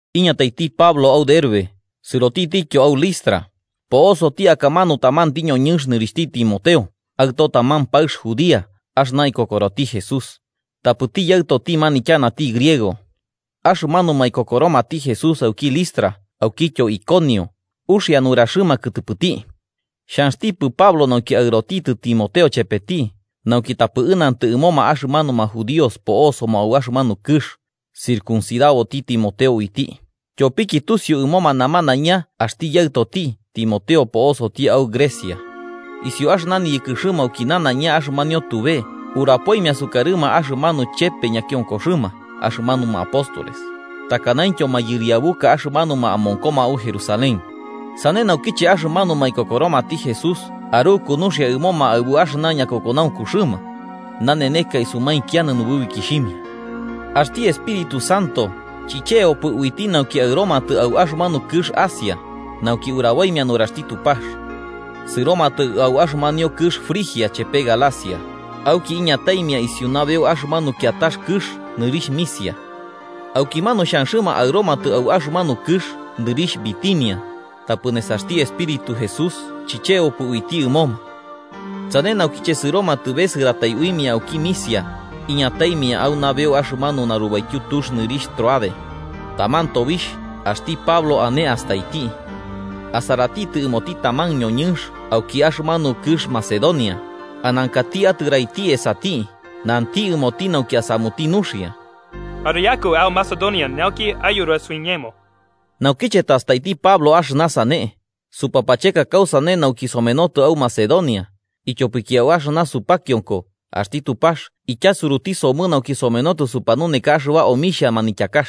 Iñataiti Pablo au Derbe sɨrotitityo au Listra, po'osoti akamanu tamanti ñoñɨnx nɨrixhti Timoteo, aɨto taman paɨx judía axɨna ikokoroti Jesús, tapɨti yaɨtoti manityanati griego. Axɨmanuma ikokoromati Jesús auki Listra aukityo Iconio, uxia nuraxɨma kɨtɨpɨti. Xhanxtipɨ Pablo nauki aɨrotitɨ Timoteo chepeti, nauki tapɨ ɨnantɨ ɨmoma axɨmanuma judíos po'osoma au axɨmanu kɨx, circuncidaboti Timoteo uiti, tyopiki tusiu ɨmo namanaiña axti yaɨtoti Timoteo po'osoti au Grecia. Isiu axɨna niyɨkɨxɨma auki nanaiña axɨmanio tube, urapoimia sukarɨma axɨmanu chepe ñakionkoxɨma axɨmanuma apóstoles, takanaintyo mayɨriabuka axɨmanuma amonkoma au Jerusalén. Sane naukiche axɨmanuma ikokoromati Jesús aruku nuxia ɨmoma aɨbu axɨna ñakokonaunkuxɨma. Naneneka isumainkianɨ nububikixhimia. Axti Espíritu Santo chichebopɨ uiti nauki aɨromatɨ au axɨmanu kɨx Asia, nauki uraboimia nuraxti Tupax. Sɨromatɨ au axɨmanio kɨx Frigia chepe Galacia, auki iñataimia isiu nabeu axɨmanu kiatax kɨx nɨrixh Misia. Aukimanu xhanxɨma aɨromatɨ au axɨmanu kɨx nɨrixh Bitinia, tapɨ nesaxti Espíritu Jesús chichebopɨ uiti ɨmoma. Sane naukiche sɨromatɨ besɨratai uimia auki Misia, iñataimia au nabeu axɨmanu narubaityu tux nɨrixh Tróade. Taman tobixh, axti Pablo ane astaiti. Asaratitɨ ɨmoti taman ñoñɨnx auki axɨmanu kɨx Macedonia, anankati atɨraiti esati, nanti ɨmoti nauki asamuti nuxia: “Ariaku au Macedonia nauki ayura suiñemo.” Naukiche tastaiti Pablo axɨna sane, supapacheka kausane nauki somenotɨ au Macedonia, ityopiki au axɨna supakionko axti Tupax ityasuruti somɨ nauki somenotɨ supanuneka axɨba omixhia manityakax.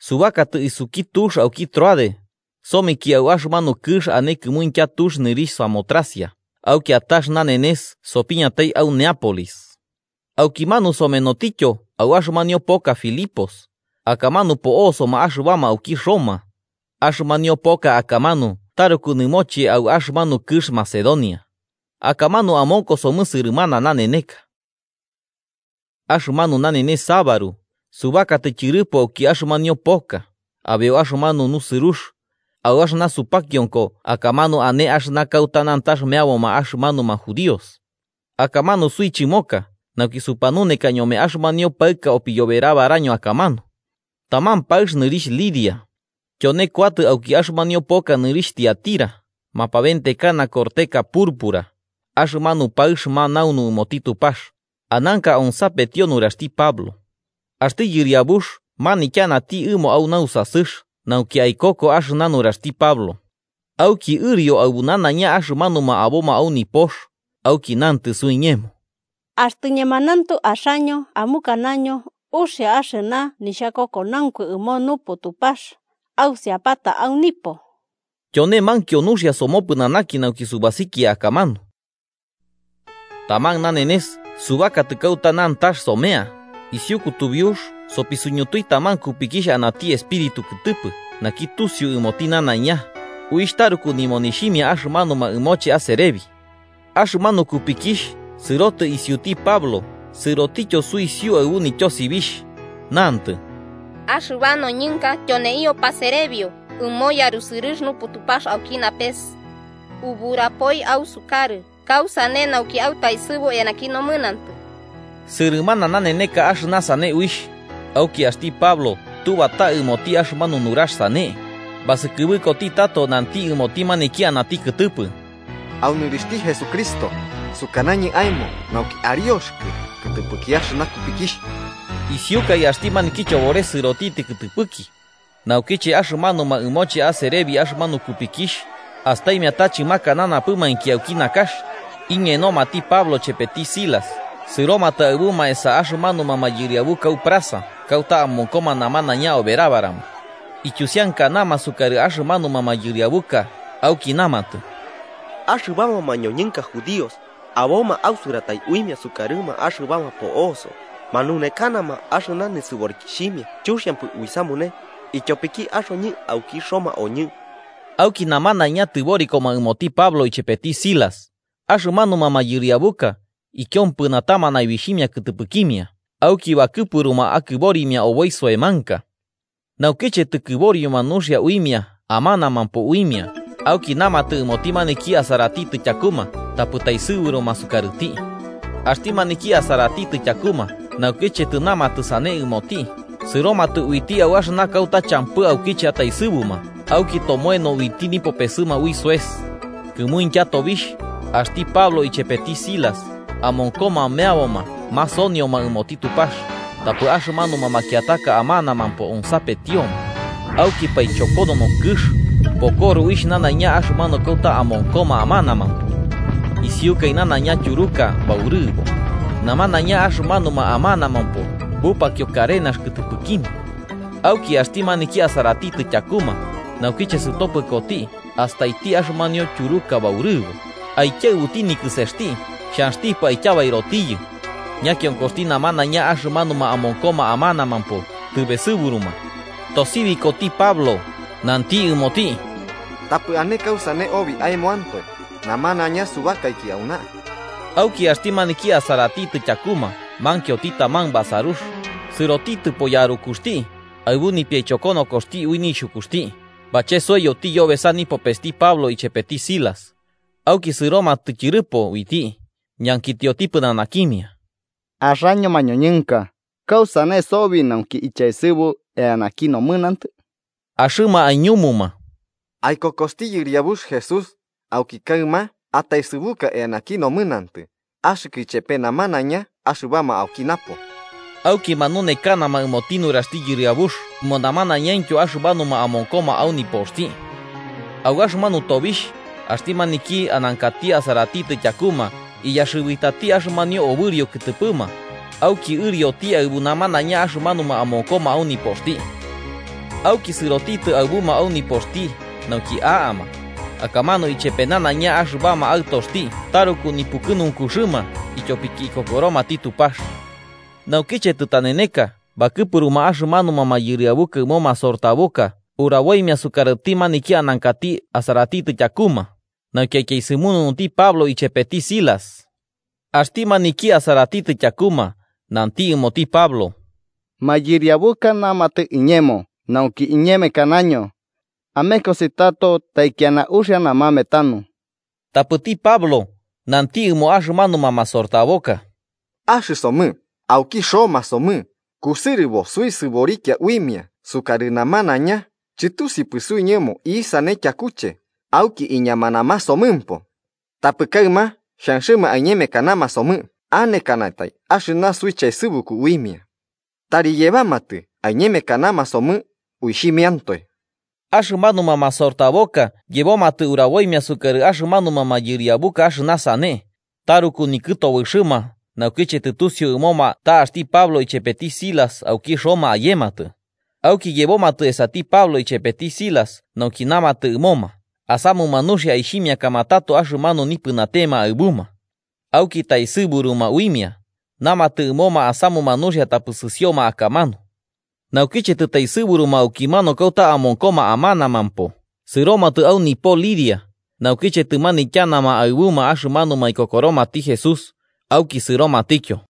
Subakatɨ isuki tux auki Tróade, someki au axɨmanu kɨx ane kɨmuintya tux nɨrixh Samotracia, au kiatax nanenes sopiñatai au Neápolis. Aukimanu somenotityo au axɨmanio poka Filipos, akamanu po'osoma axɨbama auki Roma. Axɨmanio poka akamanu taruku nɨmoche au axɨmanu kɨx Macedonia. Akamanu amonkosomɨ sɨrɨmana naneneka. Axɨmanu nanenes sabaru, subakatɨ tyɨrɨpo auki axɨmanio poka, abeu axɨmanu nusɨrux, au axɨna supakionko akamanu ane axɨna kauta nantax meaboma axɨmanuma judíos. Akamanu suichɨmoka nauki supanuneka ñome axɨmanio paɨka opiyoberabaraño akamanu. Taman paɨx nɨrixh Lidia. Tyone kuatɨ auki axɨmanio poka nɨrixh Tiatira, mapabentekana korteka purpura, axɨmanu paɨx manaunu ɨmoti Tupax, ananka onsapetio nuraxti Pablo. Axti Yɨriabux manityanati ɨmo au nausasɨx nauki aikoko axɨna nuraxti Pablo. Auki ɨrio aɨbu nanaiña axɨmanuma aboma au nipox, auki nantɨ suiñemo: –Axtɨ ñemanauntu axaño amukanaño uxia axɨna nixhakokonaunku ɨmo Nupu Tupax, ausiapata au nipo. Tyone mankio nuxia somopɨnanaki nauki subasikia akamanu. Taman nanenes subakatɨ kauta nantax somea, isiu kutubiux supisuñutui taman kupikixh anati espirítu kɨtɨpɨ naki tusiu ɨmoti nanaiña, uixh taruku nimonixhimia axɨmanuma ɨmoche aserebi. Axɨmanu kupikixh sɨrotɨ isiuti Pablo sɨrotityo suisiu aɨbu nityosibixh, nantɨ: –¡Axɨba noñɨnka tyoneio paserebio ɨmo yarusɨrɨx Nupu Tupax auki napes. Uburapoi ausukarɨ kausane nauki autaesɨbu eanaki nomɨnantɨ! Sɨrɨmana naneneka axɨna sane uixh, auki axti Pablo tubata ɨmoti axɨmanu nurax sane, basɨkɨbɨkoti tato nanti ɨmoti maniki anati kɨtɨpɨ: –Au nɨrixhti Jesucristo, sukanañɨ aemo nauki arioxɨkɨ kɨtɨpɨki axɨna kupikixh. Isiukai axti maniki chobores sɨrotitɨ kɨtɨpɨki. Naukiche axɨmanuma ɨmoche aserebi axɨmanu kupikixh, astaimia ta chɨmakananapɨmainki auki nakax, iñenomati Pablo chepeti Silas sɨromatɨ aɨbuma esa axɨmanuma mayɨriabuka au plaza kauta amonkoma namanaiña oberabarama. Ityusiankanama sukarɨ axɨmanuma mayɨriabuka auki, namatɨ: –Axɨbama mañoñɨnka judíos, aboma ausɨratai uimia sukarɨma axɨbama po'oso, manunekanama axɨna nisɨborikixhimia chuxiampɨ uisamune, ityopiki axoñɨ auki Roma oñɨ. Auki namanaiña tɨborikoma ɨmoti Pablo ichepeti Silas, axɨmanuma mayɨriabuka, ikiompɨnatama naibixhimia kɨtɨpɨkimia, auki bakɨpuruma akɨborimia oboi soemanka. Naukiche tɨkɨborioma nuxia uimia amanamampo uimia, auki namatɨ ɨmoti maniki asaratitɨ tyakuma tapɨ taesɨburuma sukarɨti. Axti maniki asaratitɨ tyakuma naukiche tɨnamatɨ sane ɨmoti, sɨromatɨ uiti au axɨna kauta champɨ aukiche ataesɨbuma auki motomoeno uiti nipopesɨma ui soes. Kɨmuintya tobixh, axti Pablo ichepeti Silas, amonkoma meaboma masonioma ɨmoti Tupax, tapɨ axɨmanuma makiataka amanamampo onsapetioma, auki paichokonono kɨx, pokoro uixh nanaiña axɨmanu kauta amonkoma amanamampo. Isiukai nanaiña tyuruka baurɨbo, namanaiña axɨmanuma amanamampo bupakio karenas kɨtɨpɨkimia. Auki axti maniki asaratitɨ tyakuma, naukiche sɨtopɨkoti astaiti axɨmanio tyuruka baurɨbo, aikiaɨbuti nikɨsesti xhanxtipɨ aityabairotiyɨ, ñakionkoxti namanaiña axɨmanuma amonkoma amanamampo tɨbesɨburuma. Tosibikoti Pablo, nanti ɨmoti: –¡Tapɨ ane kausane obi aemoantoe, namanaiña subakaiki auna! Auki axti maniki asaratitɨ tyakuma mankioti taman basarux, sɨrotitɨpo yarukuxti, aɨbu nipiaichokonokoxti ui nixhukuxti, bachesoiyoti yobesa nipopesti Pablo ichepeti Silas. Auki sɨromatɨ tyɨrɨpo uiti, ñankitioti pɨnanakimia: –Axaño mañoñɨnka, ¿kausane sobi nauki ichaesɨbu eanaki nomɨnantɨ? Axɨma aiñumuma: –Aikokosti Yɨriabux Jesús, auki kaɨma ataesɨbuka eanaki nomɨnantɨ, axɨkɨ ichepe namanaiña axɨbama auki napo. Auki manunekanama ɨmoti nuraxti Yɨriabux ɨmo namanaiñaintyo axɨmanuma amonkoma au nipoxti. Au axɨmanu tobixh, axti maniki anankati asaratitɨ tyakuma iyaxɨbitati axɨmanio obɨrio kɨtɨpɨma, auki ɨrioti aɨbu namanaiña axɨmanuma amonkoma au nipoxti. Auki sɨrotitɨ aɨbuma au nipoxti nauki a'ama, akamanu ichepe nanaiña axɨbama aɨtoxti taruku nipukɨnunkuxɨma ityopiki ikokoromati Tupax. Naukiche tɨtaneneka bakɨpuruma axɨmanuma mayɨriabuka ɨmo masortaboka uraboimia sukarɨti maniki anankati asaratitɨ tyakuma nauki aityaesɨmununuti Pablo ichepeti Silas. Axti maniki asaratitɨ tyakuma nanti ɨmoti Pablo: –Mayɨriabuka namatɨ iñemo nauki iñemekanaño. Amekosi tato taikiana uxia namame tanu. Tapɨti Pablo nanti ɨmo axɨmanuma masortaboka: –Axɨsomɨ, auki Roma somɨ, kusɨrɨbo suisɨborikia uimia sukarɨ namanaiña, chɨtusiupɨ suiñemo isane tyakuche, auki iñamanamasomɨmpo. ¿Tapɨ kaɨma xhanxɨma aiñemekanama somɨ anekanatai axɨna suichaesɨbuku uimia? Tari yebamatɨ aiñemekanama somɨ uixhimiantoe. Axɨmanuma masortaboka yebomatɨ uraboimia sukarɨ axɨmanuma mayɨriabuka axɨna sane, taruku nikɨtobɨxɨma naukiche tɨtusiu ɨmoma ta axti Pablo ichepeti Silas auki Roma ayematɨ. Auki yebomatɨ esati Pablo ichepeti Silas nauki namatɨ ɨmoma asamuma nuxia aixhimiakama tato axɨmanu nipɨnatema aɨbuma. Auki taesɨburuma uimia, namatɨ ɨmoma asamuma nuxia tapɨ sɨsioma akamanu. Naukiche tɨtaesɨburuma aukimanu kauta amonkoma amanamampo, sɨromatɨ au nipo Lidia, naukiche tɨmanityanama aɨbuma axɨmanuma ikokoromati Jesús, auki sɨromatityo.